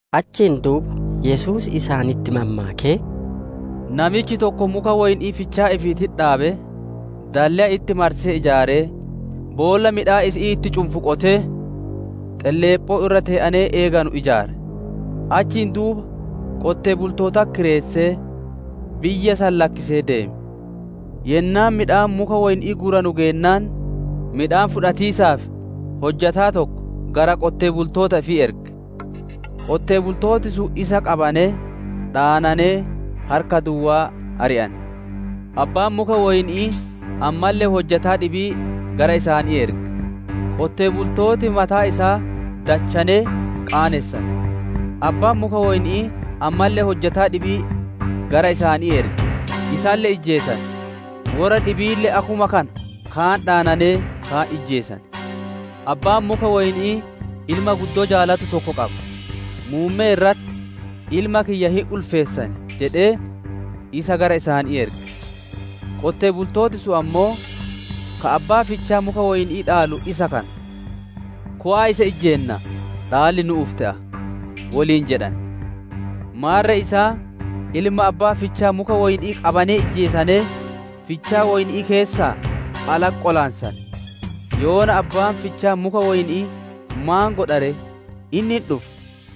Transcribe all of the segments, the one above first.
Achiin duuba Yesuus isaanitti mammaakee, «Namichi tokko muka woyni'ii fichaa ifiititti dhaabee, dalleya itti marsee ijaaree, boolla midhaan isi'ii itti cunfu qotee, xelleephoo irra tee'anee eeganu ijaare. Achiin duuba qonnaan bultootatti kireessee, biyya san lakkisee deeme. Yennaan midhaan muka woyni'ii guuranu geennaan, midhaan fudhatiisaaf hojjataa tokko gara qonnaan bultoota ifii erge. Qonnaan bultooti sun isa qabanee, dhaananee harka duwwaa ari'ane. Abbaan muka woyni'ii ammalle hojjataa dhibii gara isaanii erge; qonnaan bultooti mataa isaa dachaanee qaanessane. Abbaan muka woyni'ii ammalle hojjataa dhibii gara isaanii erge; isalle ijjeesane; worra dhibiille akkuma kana kaan dhaananee, kaan ijjeesane. Abbaan muka woyni'ii ilma guddoo jaalatu tokko qaba. Muummee irratti, ‹Ilma kiyya hin ulfeessan› jedhee, isa gara isaanii erge. Qonnaan bultooti sun ammoo, ‹Ka abbaa fichaa muka woyni'ii dhaalu isaa kana; kowa'a isa ijjeennaa, dhaalli nu'uuf hin te'a› woliin jedhane. Maarre isaan ilma abbaa fichaa muka woyni'ii qabanee ijjeesanee, fichaa woyni'ii keessaa alatti qolaansane. «Yoona abbaan fichaa muka woyni'ii maan godha ree? Inni hin dhufa;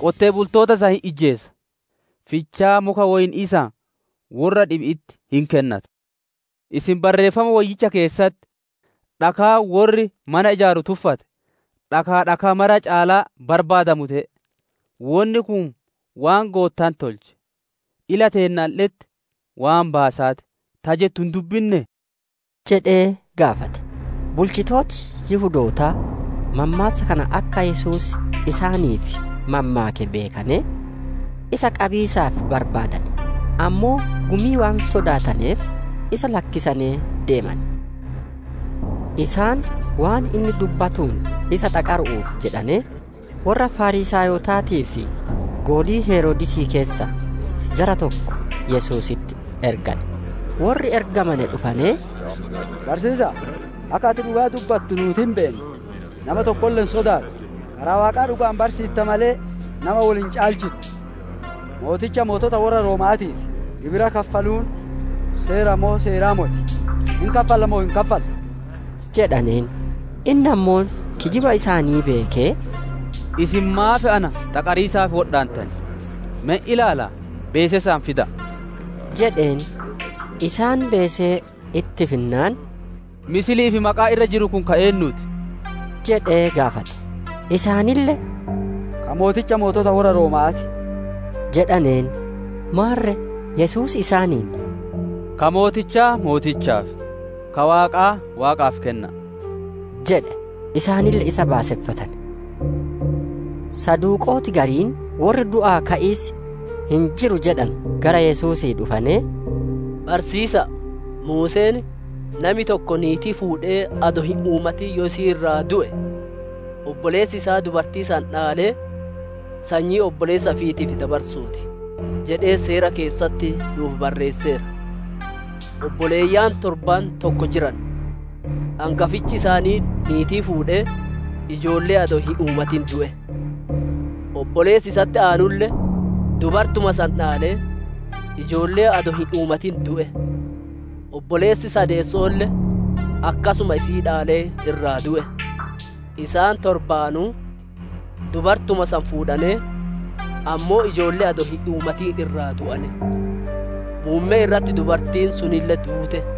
qonnaan bultoota san hin ijjeesa; fichaa muka woyni'ii san, worra dhibi'itti hin kennata. Isin Barreeffama Woyyicha keessatti ‹Dhakaan worri mana ijaaru tuffate, dhakaa dhakaa mara caalaa barbaadamu te'e. Wonni kun waan Goottaan tolche; ila teennalle'etti waan baasaa ti;› ta jettu hin dubbinnee?» jedhee gaafate. Bulchitooti Yihudootaa mammaassa kana akka Yesuus isaaniif mammaake beekanee, isa qabiisaaf barbaadane; ammoo gumii waan sodaataneef isa lakkisanee deemane. Isaan waan inni dubbatuun isa xaqaru'uuf jedhanee, worra Fariisaayotaatii fi golii Heroodisii keessaa jara tokko Yesuusitti ergane. Worri ergamane dhufanee, «Barsiisa'a! Akka ati dhugaa dubbattu nuuti hin beenna; nama tokkolle hin sodaattu; karaa Waaqaa dhuga'aan barsiitta malee, nama wol hin caalchittu. Mooticha mootota worra Rooma'aatiif gibira kaffaluun seera moo seeraa moti? Hin kaffalla moo hin kaffallu?» jedhaneen. Inni ammoo kijiba isaanii beekee, «Isin maaf na xaqariisaaf wodhaantan? Me hin ilaalaa, beesee san fida'a!» jedheen. Isaan beesee itti finnaan, «Fakki'ii fi maqaan irra jiru kun ka eennuuti?» jedhee gaafate. Isaanille, «Ka mooticha mootota worra Rooma'aa ti» jedhaneen. Maarre Yesuus isaaniin, «Ka mootichaa mootichaaf, ka Waaqaa Waaqaaf kenna'a!» jedhe; isaanille isa baaseffatane. Saduqooti gariin, worri du'aa ka'iis hin jiru jedhanu gara Yesuusii dhufanee, «Barsiisa'a! Muuseen, ‹Nami tokko niitii fuudhee adoo hin uumatin yoo isii irraa du'e, obboleessi isaa dubartii san dhaalee sanyii obboleessa ifiitiif dabarsuu ti!› jedhee Seera keessatti nu'uuf barreesseera. Obboleeyyan torbaan tokko jiran; angafichi isaanii niitii fuudhee ijoollee adoo hin uumatin du'e. Obboleessi isatti aanulle dubartuma san dhaalee, ijoollee adoo hin uumatin du'e; obboleessi sadeesso'oolle akkasuma isii dhaalee irraa du'e. Isaan torbaanuu dubartuma san fuudhanee, ammoo ijoollee adoo hin uumatin irraa du'ane. Muummee irratti dubartiin sunille duute.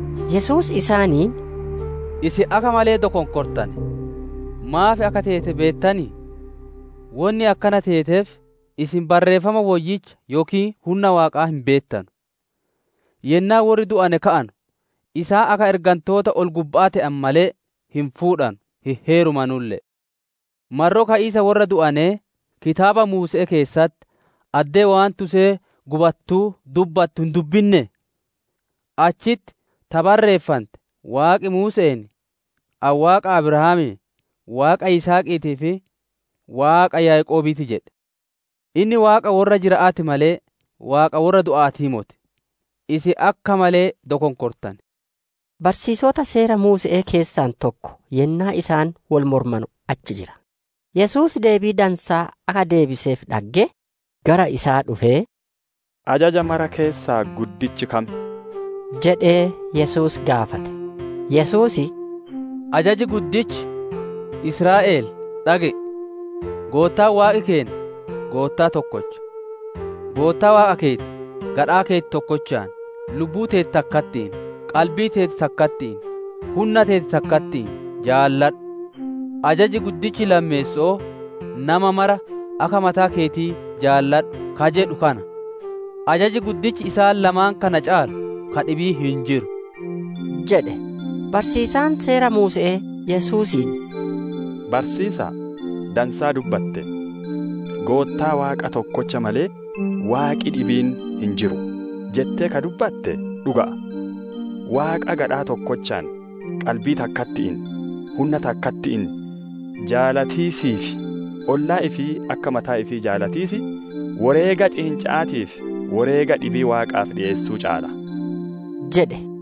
Yesuus isaaniin, «Isin akka malee dokonkortane! Maaf akka teete beettanii? Wonni akkana teeteef, isin Barreeffama Woyyicha yookiin hunna Waaqaa hin beettanu. Yennaa worri du'ane ka'anu, isaan akka ergantoota ol-gubba'aa te'an malee, hin fuudhanu, hin heerumanulle'e. Marroo ka'iisa worra du'anee: Kitaaba Muuse'ee keessatti addee waan tusee gubattuu dubbattu hin dubbinnee? Achitti ta barreeffante, Waaqi Muuse'een, ‹Ani Waaqa Abraamii, Waaqa Yisihaqiitii fi Waaqa Yaaqoobii ti› jedhe. Inni Waaqa worra jira'aa ti malee, Waaqa worra du'a'aatii moti. Isin akka malee dokonkortane» jedhe. Barsiisota Seera Muuse'ee keessaa tokko yennaa isaan wol mormanu achi jira. Yesuus deebii dansaa akka deebiseef dhaggee, gara isaa dhufee, «Ajaja mara keessaa guddichi kam?» jedhee Yesuus gaafate. Yesuus, «Ajaji guddichi, ‹Israa'el, dhage'i! Goottaan Waaqi keenna Goottaa tokkocha. Goottaa Waaqa keeti gadhaa keeti tokkochaan, lubbuu teeti takkatti'iin, qalbii teeti takkatti'iin, hunna teeti takkatti'iin› jaaladhu. Ajaji guddichi lammeesso'oo, ‹Nama mara akka mataa keetii jaaladhu› ka jedhu kana. Ajaji guddichi isaan lamaan kana caalu ka dhibiin hin jiru» jedhe. Barsiisaan Seera Muuse'ee Yesuusiin, «Barsiisa'a! Dansaa dubbatte; ‹Goottaa Waaqa tokkocha malee, Waaqi dhibiin hin jiru› jettee ka dubbate dhuga'a. Waaqa gadhaa tokkochaan, qalbii takkatti'iin, hunna takkatti'iin jaalatiisii fi ollaa ifii akka mataa ifii jaalatiis, woreega ciinca'aatii fi woreega dhibii Waaqaaf dhiyeessuu caala» jedhe.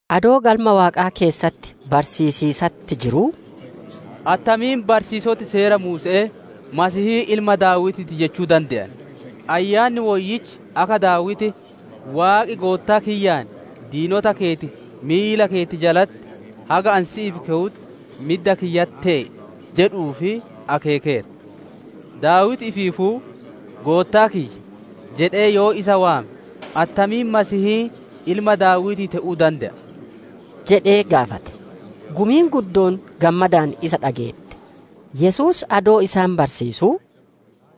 Adoo Galma waaqaa keessatti barsiisiisatti jiruu, «Attamiin barsiisoti Seera Muuse'ee, ‹Mesiihiin ilma Daawitii ti› jechuu dande'an? Ayyaanni Woyyichi akka Daawiti, ‹Waaqi Goottaa kiyyaan, diinota keeti miila keeti jalatti, haga Ani si'iif kewutti, midda kiyyatti tee'i› jedhu'uuf akeekeera. Daawiti ifiifuu, ‹Goottaa kiyya› jedhee yoo isa waame, attamiin Mesiihiin ilma Daawitii te'uu dande'a?» jedhee gaafate. Gumiin guddoon gammadaan isaa dhageette. Yesuus adoo isaan barsiisuu,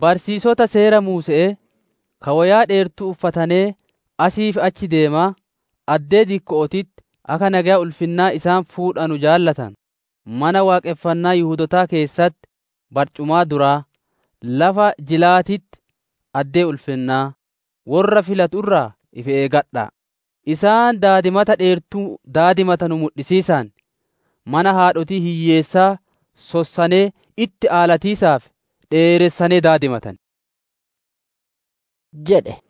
«Barsiisota Seera Muuse'ee, ka woyaa dheertuu uffatanee asii fi achi deemaa, addee dikko'ootitti akka nageya ulfinnaa isaan fuudhanu jaalatanu, Mana Waaqonfannaa Yihudootaa keessatti barcumaa duraa, lafa jilaatitti addee ulfinnaa, worra filatu irraa ifi eeggadha'a! Isaan daadimata dheertuu daadimatanu mudhisiisaan, mana haadhotii hiyyeessaa sossanee itti aalatiisaaf dheeressanee daadimatan» jedhe.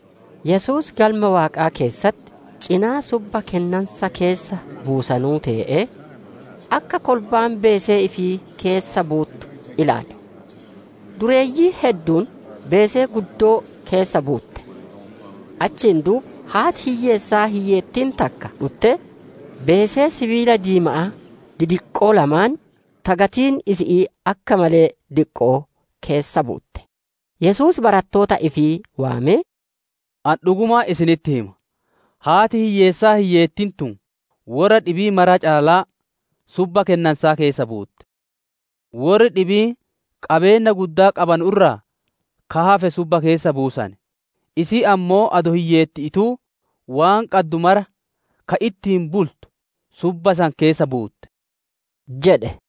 Yesuus Galma Waaqaa keessatti cinaa subba kennansa keessa buusanuu tee'ee, akka kolbaan beesee ifii keessa buuttu ilaale. Dureeyyiin hedduun beesee guddoo keessa buutte; achiin duuba haati hiyyeessaa hiyyeettiin takka dhuttee beesee sibiila diima'aa didiqqoo lamaan, ta gatiin isi'ii akka malee diqqo'oo keessa buutte. Yesuus barattoota ifii waamee, «Ani dhugumaan isinitti hima! Haati hiyyeessaa hiyyeettiin tun worra dhibii mara caalaa subba kennansaa keessa buutte jedhe. Worri dhibiin qabeenna guddaa qabanu irraa ka hafe subba keessa buusane; isiin ammoo adoo hiyyeetti'iituu, waan qaddu mara ka ittiin bultu subba san keessa buutte» jedhe.